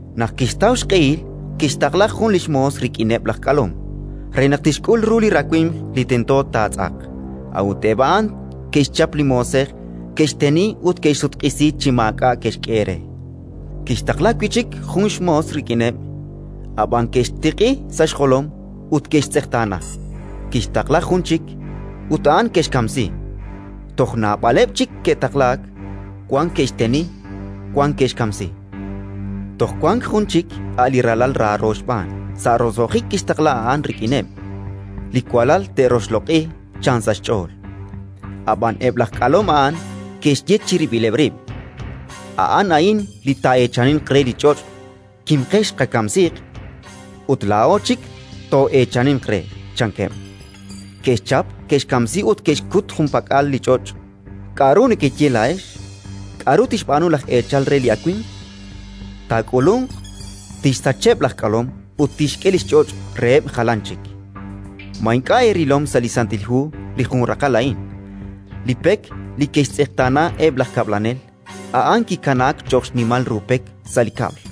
Naq kixtaw xq'ehil, kixtaqla jun li xmoos rik'ineb' laj k'alom, re naq tixk'ul ru li rawimq li tento taatz'aq. A'ut eb' a'an ke'xchap li moosej, ke'xteni ut ke'xsutq'isi chi maak'a' ke'xk'e re. Kixtaqla wi' chik jun xmoos rik'ineb'; ab'an ke'xtiq'i sa' xjolom ut ke'xtz'eqtaana. Kixtaqla jun chik, ut a'an ke'xkamsi. Toj naab'aleb' chik ke'taqlaak: wan ke'xteni, wan ke'xkamsi. “Toj wank jun chik, a' li ralal raaro xb'aan. Sa' roso'jik kixtaqla a'an rik'ineb': «Li walal te'roxloq'i», chan sa' xch'ool. Ab'an eb' aj k'alom a'an ke'xye chirib'ileb' rib': «A'an a'in li taa'eechaninq re li ch'och'. Kimqex, qakamsiiq, ut laa'o chik too'eechaninq re», chankeb'. Ke'xchap, ke'xkamsi ut ke'xkut junpak'al li ch'och'. “K'aru nekeye laa'ex? K'aru tixb'aanu laj eechal re li awimq? Taak'ulunq, tixsacheb' laj k'alom ut tixk'e li xch'och' reheb' jalan chik. “Ma ink'a' eerilom sa' li Santil Hu li jun raqal a'in: «Li pek li ke'xtz'eqtaana eb' laj kab'lanel, a'an li kikanaak cho'q xnimal ru pek sa' li kab'l.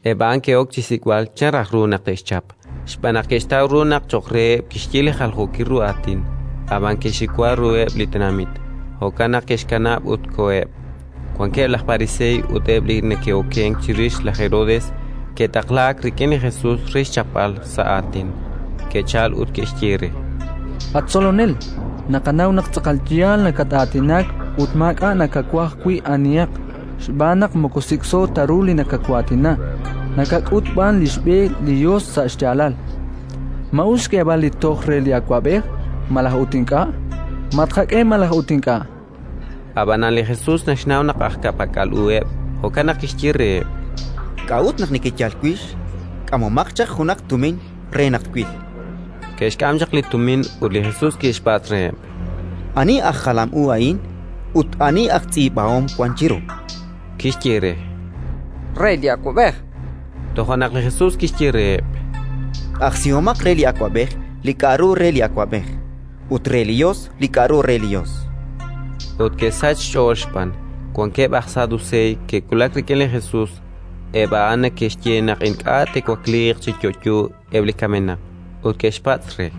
Eb' a'an ke'ok chi xsik'b'al chan raj ru naq te'xchap, xb'aan naq ke'xtaw ru naq cho'q reheb' kixye li jaljookil ru aatin; ab'an ke'xxiwa ruheb' li tenamit. Jo'kan naq ke'xkanab' ut koheb'. Wankeb' aj Pariseey ut eb' li neke'okenk chirix laj Herodes ke'taqlaak rik'in li Jesus re xchapb'al sa' aatin. Ke'chalk ut ke'xye re: —At Tzolonel, naqanaw naq tz'aqal yaal nakat-aatinak ut maak'a' nakawaj wi' anihaq, xb'aan naq moko sik'so ta ru li nakawaatina, nakak'ut b'an li xb'e li Yos sa' xyaalal. Ma us xk'eeb'al li toj re li awab'ej, malaj ut ink'a'? Ma tqak'e, malaj ut ink'a'? Ab'anan li Jesus naxnaw naq aj ka'pak'al uheb', jo'kan naq kixye reheb': —K'a'ut naq nekeyal wix? K'amomaq chaq junaq tumin re naq twil. Ke'xk'am chaq li tumin ut li Jesus kixpatz' reheb': —Ani aj jalam u a'in ut ani aj tz'iib'ahom wank chiru? Ke'xye re: —Re li awab'ej. Toja' naq li Jesus kixye reheb': —Q'ajsihomaq re li awab'ej li k'aru re li awab'ej, ut re li Yos li k'aru re li Yos. Ut ke'sachk xch'ool xb'aan. Wankeb' aj Saduseey ke'wulak rik'in li Jesus (eb' a'an neke'xye naq ink'a' te'wakliiq chi yo'yo eb' li kamenaq), ut ke'xpatz' re: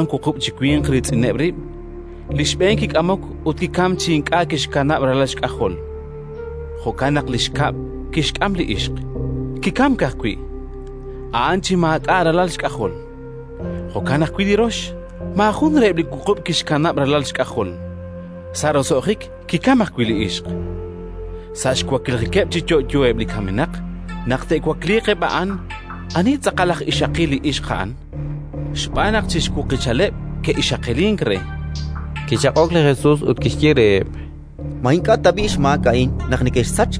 Ke'wank wuqub' chi winq riitz'ineb' rib'. Li xb'een kik'amok ut kikamk chi ink'a' kixkanab' ralal xk'ajol: jo'kan naq li xkab' kixk'am li ixq. Kikamk ajwi' a'an chi maak'a' ralal xk'ajol. Jo'kan ajwi' li rox. Maajun reheb' li wuqub' kixkanab' ralal xk'ajol. Sa' roso'jik kikamk ajwi' li ixq. Sa' xwaklijikeb' chi yo'yo eb' li kamenaq, naq te'wakliiq eb' a'an, anihaq tz'aqal aj ixaqil li ixq a'an? Xb'aan naq chi xwuqichaleb' ke'ixaqilink re. Kichaq'ok li Jesus ut kixye reheb': —Ma ink'a' tab'i' xmaak a'in naq nekexsachk,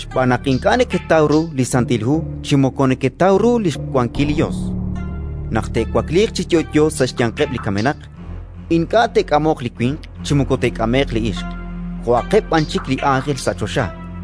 xb'aan naq ink'a' neketaw ru li Santil Hu chi moko neketaw ru li xwankil li Yos? Naq te'wakliiq chi yo'yo sa' xyanqeb' li kamenaq, ink'a' te'k'amoq li winq chi moko te'k'ame'q li ixq, jo'aqeb' b'an chik li ánjel sa' choxa.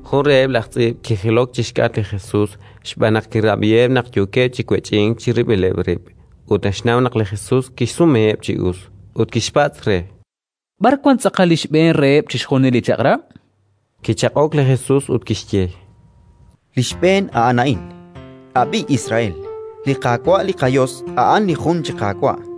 Jun reheb' laj tz'iib' kijilok chi xk'atq li Jesus xb'aan naq kirab'iheb' naq yookeb' chi wech'ink chirib'ileb' rib' ut naxnaw naq li Jesus kixsumeheb' chi us. Ut kixpatz' re: —B'ar wank tz'aqal li xb'een reheb' chixjunil li chaq'rab'? Kichaq'ok li Jesus ut kixye: —Li xb'een a'an a'in: «Ab'i, Israel: li Qaawa' li qaYos a'an li jun chi Qaawa'.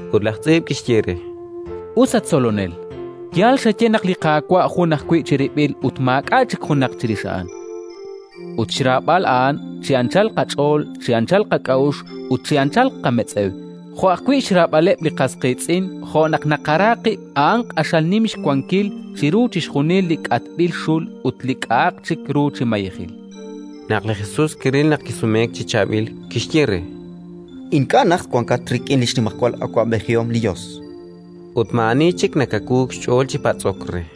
Ut laj tz'iib' kixye re: —Us, at Tzolonel. Yaal xaye naq li Qaawa' jun ajwi' chirib'il ut maak'a' chik junaq chirix A'an, ut xraab'al A'an chi anchal qach'ool, chi anchal qak'a'uxl ut chi anchal qametz'ew, jo' ajwi' xraab'aleb' li qas qiitz'in jo' naq naqara qib' a'an q'axal nim xwankil chiru chixjunileb' li k'atb'il xul ut li k'a'aq chik ru chi mayejil. Naq li Jesus kiril naq kisumeek chi chaab'il, kixye re: —Ink'a' najt wankat rik'in li xnimajwal awab'ejihom li Yos. Ut maa'ani chik nakawuuk xch'ool chi patz'ok re.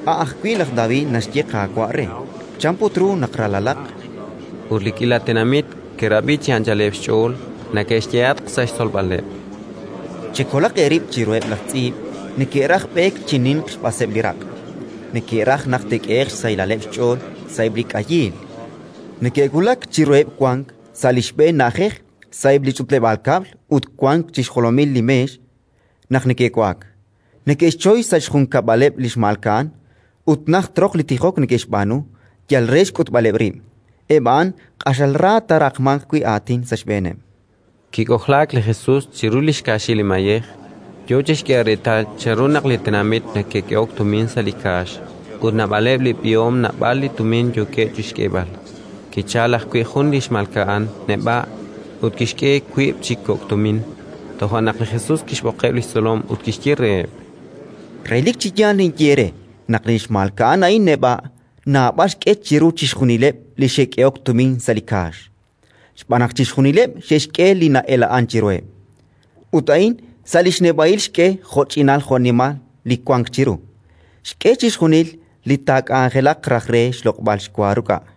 A' ajwi' laj David naxye Qaawa' re. Chan put ru naq ralalaq? Ut li k'iila tenamit neke'rab'i chi anchaleb' xch'ool. Li Jesus ut eb' laj tz'iib' Naxyehatq sa' xtzolb'aleb': “Chekolaq eerib' chiruheb' laj tz'iib': neke'raj b'eek chi ninq xb'aseb' li raq', neke'raj naq te'k'ehe'q xsahilaleb' xch'ool sa'eb' li k'ayiil; neke'wulak chiruheb' wank sa' li xb'een na'ajej sa'eb' li ch'utleb'aal kab'l ut wank chi xjolomil li meex naq neke'wa'ak; neke'xchoy xsa' xjunkab'aleb' li xmalka'an, ut najt roq li tijok neke'xb'aanu yal re xk'utb'aleb' rib'. Eb' a'an q'axal ra taaraqmanq wi' aatin sa' xb'eeneb'”. Kik'ojlaak li Jesus chiru li xkaaxil li mayej, yo chi xk'eeb'al reetal chanru naq li tenamit neke'k'ehok tumin sa' li kaax: ut naab'aleb' li b'ihom naab'al li tumin yookeb' chi xk'eeb'al. Kichalk ajwi' jun li xmalka'an neb'a', ut kixk'e wiib' chi kok' tumin. Toja' naq li Jesus kixb'oqeb' li xtzolom ut kixye reheb': —Relik chi yaal ninye eere naq li xmalka'an a'in neb'a' naab'al xk'e chiru chixjunileb' li xe'k'ehok tumin sa' li kaax. Xb'aan naq chixjunileb' xe'xk'e li na'ela'ank chiruheb'; ut a'in sa' li xneb'a'il xk'e jo'ch'inal jo'nimal li wank chiru, xk'e chixjunil li taak'anjelaq raj re xloq'b'al xwa ruk'a'.